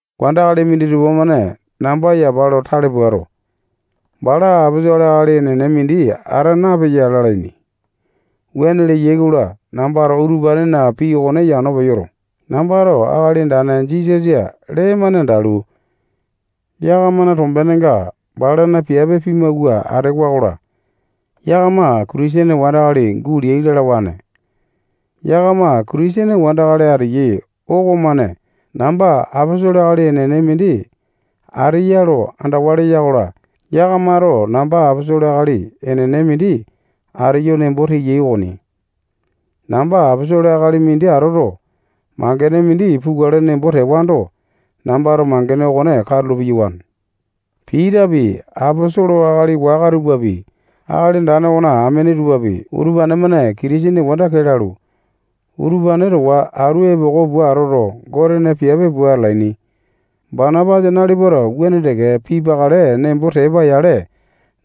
Wandakali minditupa-mane namba yapa lo tale puato, bala aposolo akali enene mindi ata napeya lalaini. Wuane leyai-kola, nambato utupanena pii okone yano peyoto, nambato Akali Andane Jisasa lee-mane andalu, yakamana tombenenga balana piape pimawua atewa-kola, yakama Kitisene wandakali guleai lalawane. Yakama Kitisene wandakali ateyai okomane namba aposolo akali enene mindi ateya lo andawa leya-kola, yakamato namba aposolo akali enene mindi ateyo nembo teyai okoni. Namba aposolo akali mindi atoto, mangene mindi pukale nembo tewando, nambato mangene okone katulo piyawane. Pitapi, aposolo akali waka tupapi, Akali Andane okona amene tupapi, utupane-mane Kitisene wanda kee lalu, utupane towa atu epoko pua atoto, Gotena piape pua atalaini. Banapasa nalipato wuane teke pipakale nembo tepa-yale,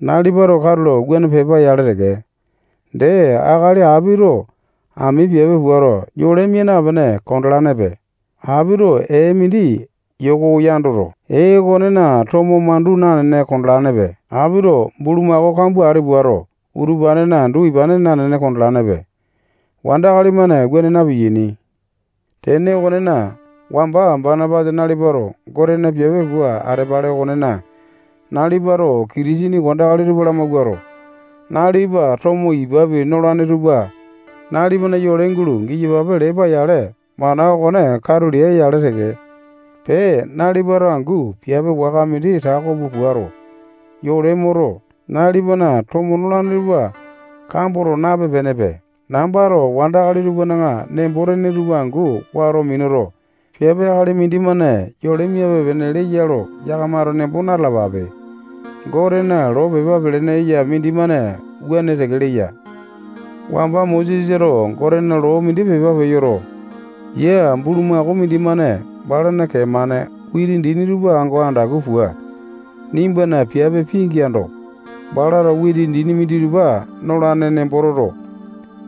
nalipato katulo wuane pepa-yale teke. Dee, akali apito ami piape puato, yole mia napene kondalanepe. Apito ee mindi yoko yandoto, ee okonena tomo mandu nanene kondalanepe. Apito bulumako kambua ati puato, utupanena andu ipane nanene kondalanepe. Wandakali-mane wuane na-piyaini. Tene okonena, wamba Banapasa nalipato Gotena piape pua atepale okonena, nalipato Kitisene wandakali tupa lamawuato, nalipa tomo ipapi nolane tupa nalipana yole gulo giyapape lepa-yale, mana okone katu lea-yale teke. Pee, nalipato angu piape waka mindi tako pua puato, yole moto, nalipana tomo nolane tupa kamboto, nape-penepe. Nambato wandakali tupana nembo-tene tupa angu wato minuto, piape akali mindimane yole miape-pene leya lo yakamato nembo na-talapape. Gotena loo pepa pelene eya mindimane wuane teke leya. Wamba Mosesato Gotena loo mindi pepa peyoto, yia bulumako mindimane balana kee-mane witi dini tupa ango andaku pua, nimbana piape pingeando, balato witi dini minditupa nolane nembo toto,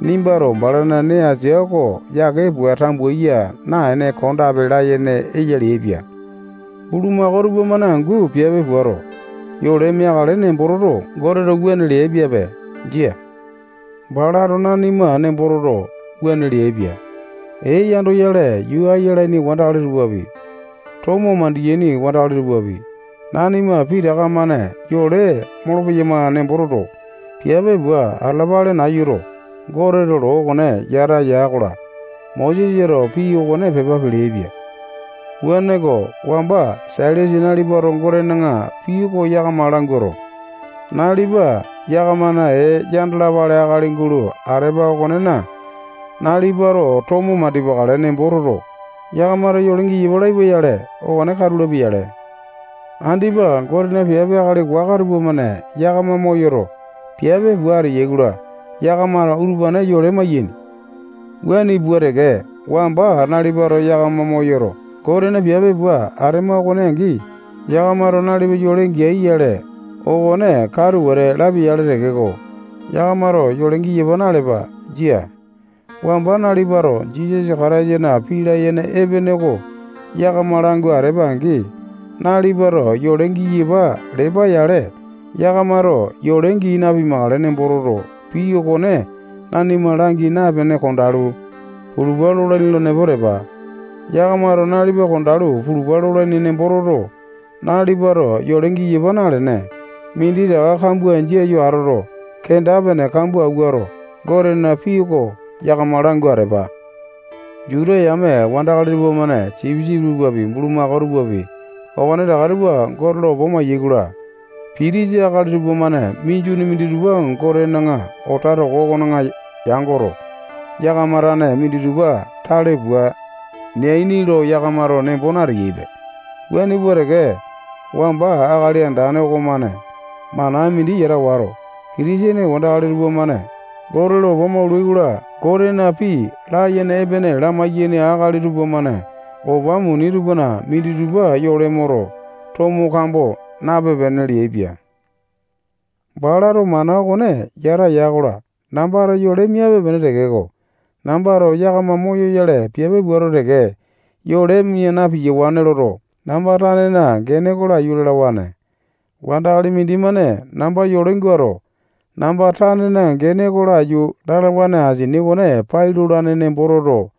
nimbato balana nee asia oko yake pua tambuya naene kondape layene eya leaipia. Bulumako tupamane angu piape puato, yole meakale nembo toto, Goteto wuane leaipiape. Jia. Balato nanima nembo toto, wuane leaipia. Ee yandoyale yuu ayalaini wandakali tupapi, tomo mandiyaini wandakali tupapi, nanima pitaka-mane yole molopeyama nembo toto, piape pua atalapale nayuto, Goteto loo okone yata ya-kola, Mosesato pii okone pepa peleaipia. Wuaneko, wamba Sailasa nalipato Gotena pii oko yakama languato, nalipa yakamana ee yandalapale akali gulo atepa okonena, nalipato tomo mandipakale nembo toto, yakamato yole giyapa laipa-yale, okone katu lapia-yale. Andipa Gotena piape akali waka tupamane yakama moyoto, piape pua ateyai-kola, yakamato utupane yole maiyaini. Wuane pua teke, wamba nalipato yakama moyoto, Gotena piape pua atema okone angi, yakamato nalipa yole geai-yale, okone katu wete lapia-yale tekeko, yakamato yole giyapa nalepa. Jia. Wamba nalipato Jisasa Kataisana pii layene epene oko yakama langu atepa-angi, nalipato yole giyapa lepa-yale, yakamato yole gii napimakale nembo toto, pii okone nanima langi napene kondalu, pulupa lolaini nembo tepa. Yakamato nalipa kondalu pulupa lolaini nembo toto, nalipato yole giyapa nalene, minditaka kambua jia yo atoto, kenda-pene kambua awuato, Gotena pii oko yakama langu atepa. Juta yame wandakali tupamane sipisipi tupapi, bulumako tupapi, okonetaka tupa Gote lo opa mayai-kola, pitisa akali tupamane minjuni minditupa Gotena alata toko okona yangoto, yakama tane minditupa tale pua neaini lo yakamato nembo nateyaipe. Wuane pua teke, wamba Akali Andane okomane mana mindi yata wato, Kitisene wandakali tupamane Gote lo opa maulai-kola, Gotena pii layene epene lamai-yaini akali tupamane opa muni tupana minditupa yole moto, tomo kambo nape-pene leaipia. Balato mana okone yata ya-kola, nambato yole miape-pene tekeko, nambato yakama moyoyale piape puato teke, yole mia na-piyawane loto, namba tanena gene oko laiyu lalawane. Wandakali mindimane namba yole guato, namba tanena gene oko laiyu lalawane asini okone pai lolane nembo toto,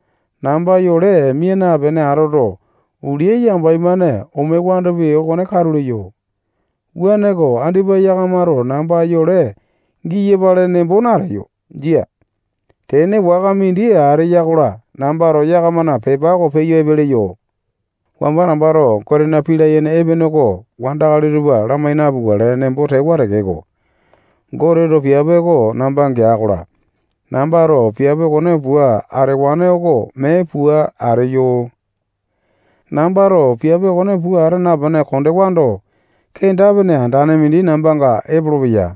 namba yole mia napene atoto, ulia yambai-mane omewandopi, okone katu leyo. Wuaneko, andipa yakamato namba yole giyapale nembo nateyo. Jia. Tene waka mindi ateya-kola, nambato yakamana pepa oko peyo epe leyo. Wamba nambato Gotena pii layene epene oko wandakali tupa lamai napukale nembo tewa tekeko, Goteto piape oko namba gea-kola, nambato piape okone pua atewane oko mee pua ateyo. Nambato piape okone pua ata napene kondewando, kenda-pene andane mindi nambanga epolopeya.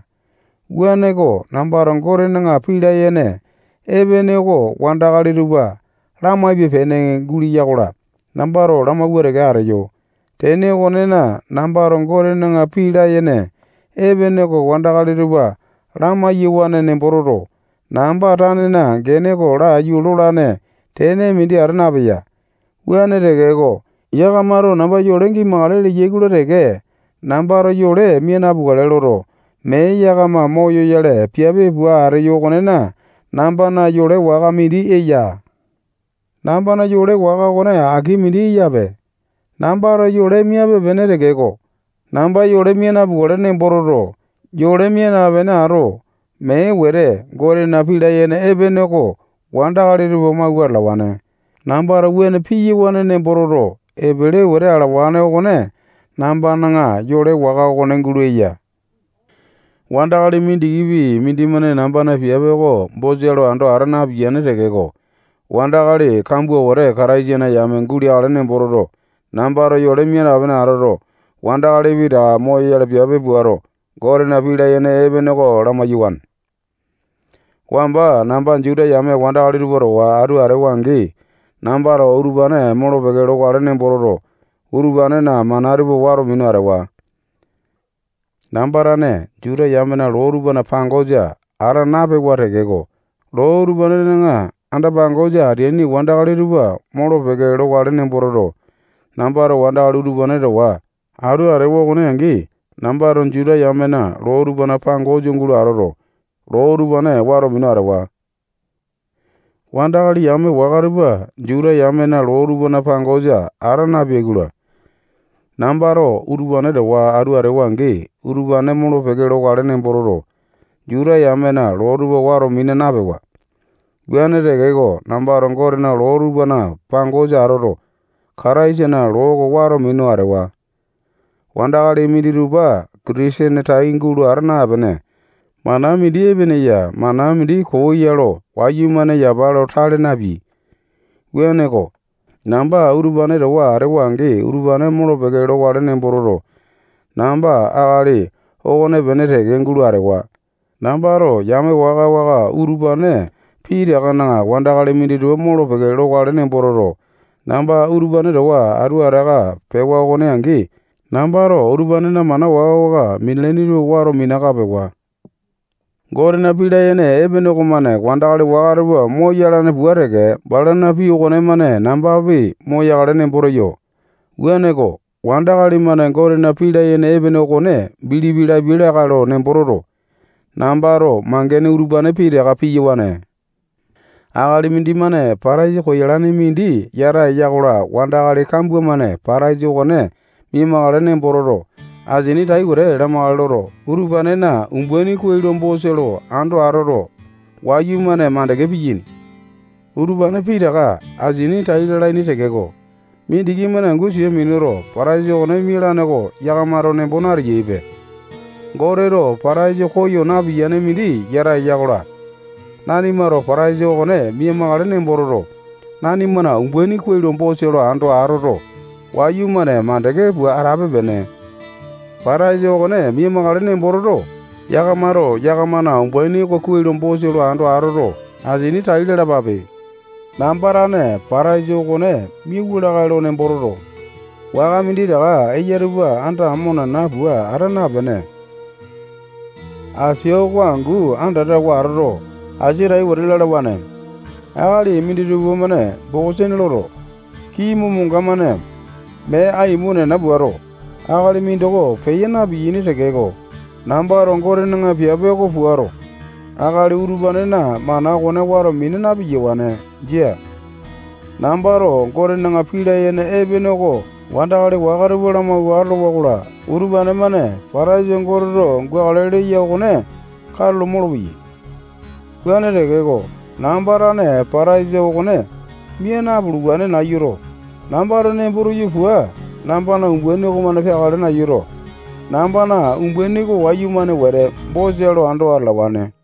Wuaneko, nambato Gotena pii layene epene oko wandakali tupa lamaipe-pene guleya-kola, nambato lamawua teke ateyo. Tene okonena, nambato Gotena pii layene epene oko wandakali tupa lamai-yawane nembo toto, namba tanena gene oko laiyu lolane tene mindi ata napeya. Wuane tekeko, yakamato namba yole gimakale leyai-kola teke, nambato yole mia napukale loto, mee yakama moyoyale piape pua ateyo okonena, nambana yole waka mindi eya. Nambana yole waka okone aki mindi eyape. Nambato yole miape-pene tekeko, namba yole mia napukale nembo toto, yole mia napene ato, mee wete Gotena pii layene epene oko wandakali tupa lamawua atalawane. Nambato wuane piyawane nembo toto, epele wete alawane okone nambana yole waka okone gulo eya. Wandakali mindikipi mindimane nambana piape oko bosa lo ando ata napiyane tekeko, wandakali kambua wete Kataisana yame guleakale nembo toto, nambato yole mia napene atoto, wandakali pitaka moyoyale piape puato, Gotena pii layene epene oko lamai-yawane. Wamba namba Juta yame wandakali tupa towa atu atewa-angi, nambato utupane molo-peke lokale nembo toto, utupanena mana tupa wato minu atewa. Namba tane Juta yamena loo tupana pangosa ata napewa tekeko, loo utupanena anda-pangosa ateaini wandakali tupa molo-peke lokale nembo toto, nambato wandakali utupane towa atu atewa okone angi, nambato Juta yamena loo tupana pangosa gulo atoto, loo utupane wato minu atewa. Wandakali yame waka tupa Juta yamena loo tupana pangosa ata napeai-kola, nambato utupane towa atu atewa-angi, utupane molo-peke lokale nembo toto, Juta yamena loo tupa wato mina napewa. Wuane tekeko, nambato Gotena loo tupana pangosa atoto, Kataisana loo oko wato minu atewa. Wandakali minditupa Kitisene tai gulo ata napene, mana mindi epene ya, mana mindi koo ya lo wayumane yapa lo tale napeai. Wuaneko, namba utupane towa atewa-angi, utupane molo-peke lokale nembo toto, namba akali okonepene teke gulo atewa. Nambato yame waka-waka utupane pitakana wandakali minditupa molo-peke lokale nembo toto, namba utupane towa atu ataka pewa okone angi, nambato utupanena mana waka-waka minalaini tupa wato minaka pewa. Gotena pii layene epene okomane wandakali waka tupa moyalane pua teke, balana pii okonemane nambapi moyakale nembo teyo. Wuaneko, wandakali-mane Gotena pii layene epene okone bilipi lapiai lakae lo nembo toto, nambato mangene utupane pitaka piyawane. Akali mindimane pataisa koyalane mindi yata eya-kola, wandakali kambua-mane pataisa okone mia-makale nembo toto, asini tai wete lamakale loto, utupanena umbaini kuai lo bosa lo ando atoto, wayumane mandeke piyaini. Utupane pitaka asini tai lalaini tekeko, mindiki-mane angu sia minuto, pataisa okone mialane oko yakamato nembo nateyaipe. Goteto pataisa koya napiyane mindi yata eya-kola, nanimato pataisa okone mia-makale nembo toto, nanimana umbaini kuai lo bosa lo ando atoto, wayumane mandeke pua atape-pene. Pataisi okone mia-makale nembo toto, yakamato yakamana umbaini oko kuai lo bosa lo ando atoto, asini tai lalapape. Namba tane pataisa okone miawa lakae lo nembo toto, waka minditaka eya tupa andamo nena pua ata napene, asia oko angu andatawa atoto, asia tai wete lalawane. Akali minditupa-mane bokosene loto, kii momanga-mane mee aimo nena puato, akali mindoko peya na-piyaini tekeko, nambato Gotena piape oko puato, akali utupanena mana okone wato mina na-piyawane. Jia. Nambato Gotena pii layene epene oko wandakali waka tupa lamawua atolowa-kola, utupane-mane pataisa Goteto gukale leya okone katulo molopeyai. Wuane tekeko, namba tane pataisa okone mia napuluwane nayuto, nambato nembo teyo pua nambana umbaini okomane peakale nayuto, nambana umbaini oko wayumane wete bosa lo ando atalawane.